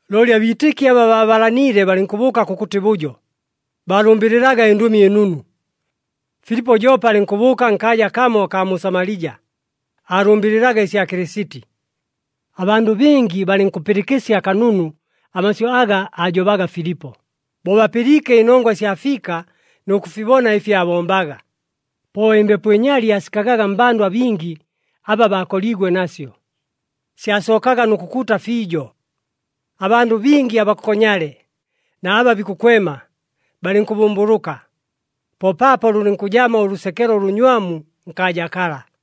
Looli abiitɨki aba baabalaniile balɨnkʉbʉʉka kʉkʉtɨ bʉjo, baalʉmbɨlɨlaga ɨNdʉmi ɨNunu. Filipo joope alɨnkʉbʉʉka nkaaja kamo akaa mu Samalija, aalʉmbɨlɨlaga ɨsya Kɨlɨsiti. Abandʉ bingi balɨnkʉpɨlɨkɨsya kanunu amasyʉ aga aajobaga Filipo, bo bapɨliike ɨnongwa ɨsya fiika nʉ kʉfibona ɨfi aabombaga. Po ɨmbepo ɨnyali aasikagaga mmbandʉ abingi aba baakoliigwe nasyo. Syasookaga nʉ kʉkuuta fiijo. Abandʉ bingi abakokonyale na aba bikʉkwema balɨnkʉbʉmbʉlʉka. Po paapo lʉlɨnkʉjamo ʉlʉsekelo ʉlʉnywamu nkaaja kala.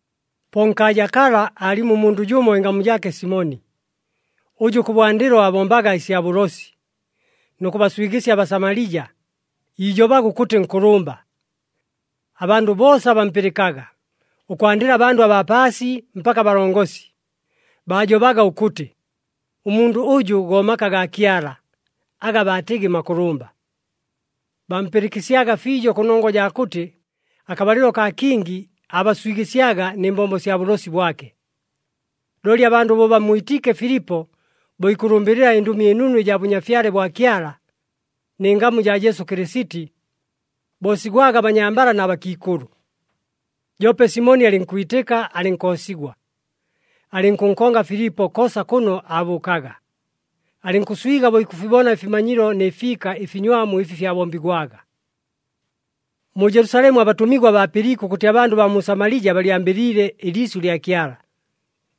Po nkaaja kala, aalimo ʉmundʉ jʉmo ɨngamu jaake Simoni, ʉjʉ kʉbwandɨlo aabombaga ɨsya bʉlosi, nʉ kʉbaswigɨsya aBasamalija, iijobaga ʉkʉtɨ nkʉlʉmba. Abandʉ boosa bampɨlɨkaga, ʉkwandɨla abandʉ abaa paasi mpaka abalongosi, baajobaga ʉkʉtɨ, “Ʉmundʉ ʉjʉ go Maka gaa Kyala, aga baatɨgɨ Makʉlʉmba.” Bampɨlɨkɨsyaga fiijo kʉnongwa jaa kʉtɨ akabalɨlo kaa kingi aabaswigɨsyaga nɨ mbombo sya bʉlosi bwake. Looli abandʉ bo bammwitiike Filipo bo ikʉlʉmbɨlɨla ɨNdʉmi ɨNunu ɨjaa Bʉnyafyale bwa Kyala, nɨ ngamu jaa Jesu Kɨlɨsiti, boosigwaga abanyambala na bakiikʉlʉ. Joope Simoni alɨnkwitɨka alɨnkoosigwa. Alɨnkʉnkonga Filipo koosa kʉno aabʉʉkaga, alɨnkʉswiga bo ikʉfibona ɨfimanyilo nɨ fiika ɨfinywamu ɨfi fyabombigwaga. Mu Jelusalemu abatʉmigwa baapɨliike ʉkʉtɨ abandʉ baa mu Samalija balyambɨliile ɨliisyʉ lya Kyala,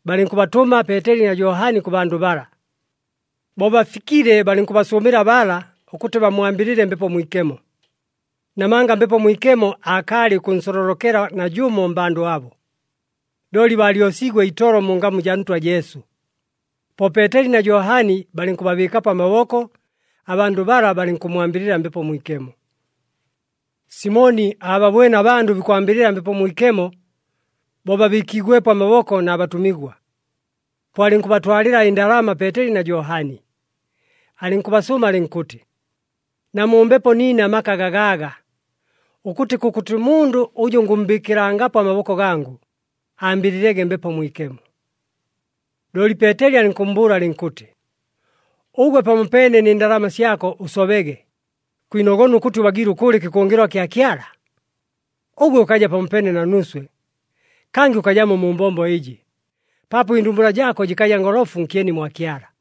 balɨnkʉbatʉma Peeteli na Johani kʉ bandʉ bala. Bo bafikile balɨnkʉbasʉʉmɨla bala, ʉkʉtɨ bammwambɨlɨle Mbepo Mwikemo, namanga Mbepo Mwikemo aakaalɨ ʉkʉnsololokela najʉmo mmbandʉ abo, looli baalyosiigwe itolo mu ngamu jaa Ntwa Jesu. Po Peeteli na Johani balɨnkʉbabɨɨkapo amaboko, abandʉ bala balɨnkʉmmwambɨlɨla Mbepo Mwikemo. Simoni aababwene abandʉ bikwambɨlɨla Mbepo Mwikemo bo babɨɨkiigwepo amaboko na batʉmigwa. Po alɨnkʉbatwalɨla ɨndalama Peeteli na Johani, alɨnkʉbasʉʉma alɨnkʉtɨ, “Namumbepo niine amaka gagaaga, ʉkʉtɨ kʉkʉtɨ mundʉ ʉjʉ ngʉmmbɨɨkɨlangapo amaboko gangʉ, ambɨlɨlege Mbepo Mwikemo.” Looli Peeteli alɨnkʉmmbʉʉla alɨnkʉtɨ, “Ʉgwe pamopeene nɨ ndalama syako ʉsobege! Kwinogona ʉkʉtɨ ʉbagiile ʉkʉʉla ɨkɨkʉngɨlwa kya Kyala! Ʉgwe ʉkaja pamopeene na nuuswe, kangɨ ʉkajamo mu mbombo ɨjɨ, paapo ɨndumbula jaako jɨkaja ngolofu nkyeni mwa Kyala.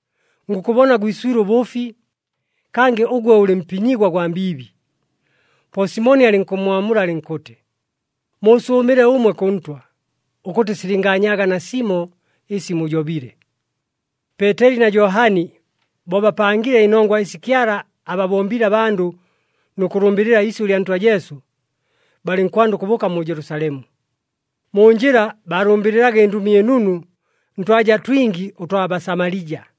Ngʉkʉbona gwiswile ʉbʉʉfi, kangɨ ʉgwe ʉlɨ mpinyigwa gwa mbiibi.” Po Simoni alɨnkʉmmwamula alɨnkʉtɨ, “Muusʉʉmɨle ʉmwe kʉ Ntwa, ʉkʉtɨ silɨngaanyaaga nasimo ɨsi mujobile!” Peeteli na Johani bo bapangile ɨnongwa ɨsi Kyala ababombiile abandʉ nʉ kʉlʉmbɨlɨla iisyʉ lya Ntwa Jesu, balɨnkwanda ʉkʉbʉʉka mu Jelusalemu. Mu njɨla baalʉmbɨlɨlaga ɨNdʉmi ɨNunu ntwaja twingi ʉtwa Basamalija.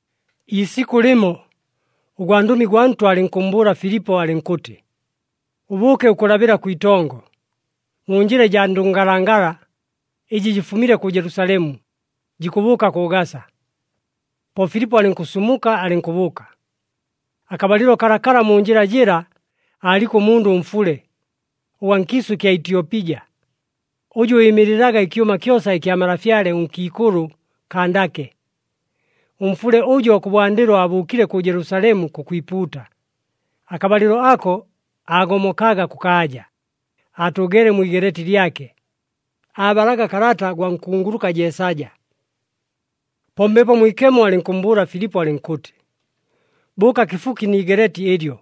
Iisikʉ lɨmo, ʉgwandʉmi gwa Ntwa alɨnkʉmmbʉʉla Filipo alɨnkʉtɨ, “Ʉbʉʉke ʉkʉlabɨla kwitongo, mu njɨla ɨjaa ndʉngalangala, ɨjɨ jɨfumile kʉ Jelusalemu, jikʉbʉʉka kʉ Gasa.” Po Filipo alɨnkʉsumuka alɨnkʉbʉʉka. Akabalɨlo kalakala mu njɨla jɨla aaliko ʉmundʉ ʉmfule, ʉgwa nkiisʉ kya Ityopija. Ʉjʉ ɨɨmɨlɨlaga ɨkyʉma kyosa ɨkya malafyale ʉnkiikʉlʉ Kandake. Ʉmfule ʉjo, kʉbwandɨlo aabʉʉkile kʉ Jelusalemu kʉkwipuuta, akabalɨlo ako aagomokaga kʉkaaja, aatʉʉgeele mwi igeleeti lyake, aabalaga kalata gwa nkunguluka Jeesaja. Po Mbepo Mwikemo alɨnkʉmmbʉʉla Filipo, alɨnkʉtɨ, “Bʉʉka kɨfuki ni igeleeti ɨlyo,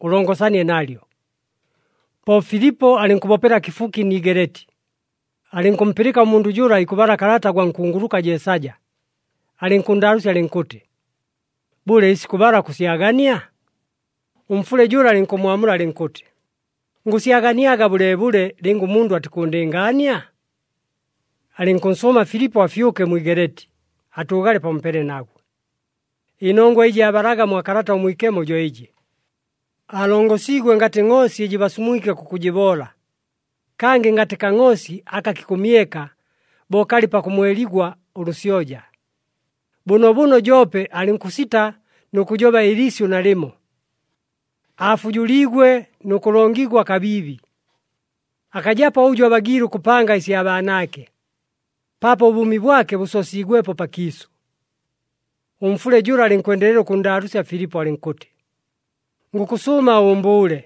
ʉlongosanie nalyo.” Po Filipo alɨnkʉbopela kɨfuki ni igeleeti, alɨnkʉmpɨlɨka ʉmundʉ jʉla ikʉbala kalata gwa nkunguluka Jeesaja, alɨnkʉnndaalʉʉsya alɨnkʉtɨ, “Bʉle, ɨsi kʉbala kʉsyagania?” Ʉmfule jʉla alɨnkʉmmwamula alɨnkʉtɨ, “Ngʉsyaganiaga bʉleebʉle, lɨnga ʉmundʉ atikʉʉndɨngaania?” Alɨnkʉnsʉʉma Filipo afyʉke mwi igeleeti, atʉʉgale pamopeene nagwe. Ɨnongwa ɨjɨ aabalaga mwa Kalata ʉMwikemo jo ɨjɨ, “Aalongosiigwe ngatɨ ngʼoosi ɨjɨ basumwike kʉkʉjɨboola, kangɨ ngatɨ kangʼoosi aka kikʉmyeka bo kalɨ pakʉmweligwa ʉlʉsyoja, bʉnoobʉno joope alɨnkʉsita nʉ kʉjoba ɨliisyʉ nalɨmo. Aafujuliigwe nʉ kʉlongigwa kabiibi. Akajapo ʉjʉ abagiile ʉkʉpanga ɨsya baanaake, paapo ʉbʉʉmi bwake bʉsoosiigwepo pakiisʉ.” Ʉmfule jʉla alɨnkwendelela ʉkʉnndaalʉʉsya Filipo alɨnkʉtɨ, “Ngʉkʉsʉʉma ʉʉmbʉʉle,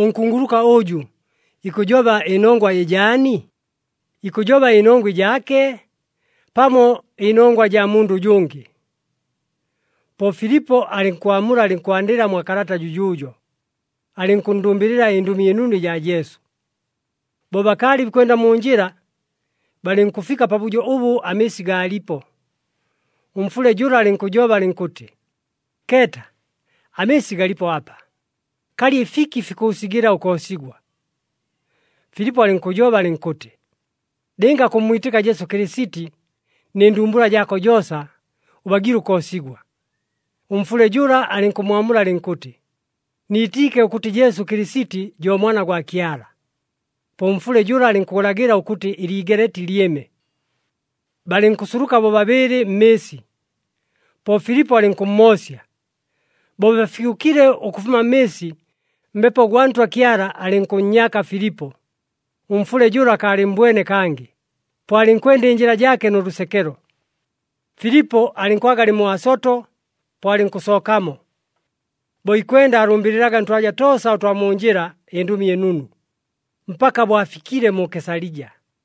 ʉnkunguluka ʉjʉ ikʉjoba ɨnongwa ɨjaani? Ikʉjoba ɨnongwa ɨjaake, pamo ɨnongwa jaa mundʉ ʉjʉngɨ?” Po Filipo alɨnkwamula alɨnkwandɨla mwa kalata jʉjʉʉjo, alɨnkʉnndʉmbɨlɨla ɨNdʉmi ɨNunu ɨjaa Jesu. Bo bakaalɨ bikwenda mu njɨla, balɨnkʉfika pabʉjo ʉbʉ amɨɨsi gaalipo. Ʉmfule jʉla alɨnkʉjoba alɨnkʉtɨ, “Keeta! Amɨɨsi galipo apa. Kalɨ ɨfiki fikʉʉsigɨla ʉkoosigwa?” [ Filipo alɨnkʉjoba alɨnkʉtɨ, “Lɨnga kʉmmwitɨka Jesu Kɨlɨsiti nɨ ndumbula jaako joosa, ʉbagiile ʉkoosigwa.” Ʉmfule jʉla alɨnkʉmmwamula alɨnkʉtɨ, “Niitiike ʉkʉtɨ Jesu Kɨlɨsiti jo Mwana gwa Kyala.”] Po ʉmfule jʉla alɨnkʉlagɨla ʉkʉtɨ ɨliigeleeti lyɨme, balɨnkʉsuluka bobabɨɨlɨ mmɨɨsi. Po Filipo alɨnkʉmmoosya. Bo bafyʉkile ʉkʉfuma mmɨɨsi, Mbepo gwa Ntwa Kyala alɨnkʉnnyaka Filipo, ʉmfule jʉla akaalɨmmbwene kangɨ, po alɨnkwenda ɨnjɨla jaake nʉ lʉsekelo. Filipo alɨnkwaga alɨ mu Asoto, po alɨnkʉsookamo. Bo ikwenda aalʉmbɨlɨlaga ntwaja toosa ʉtwa mu njɨla ɨNdʉmi ɨNunu, mpaka bo afikile mu Kesalija.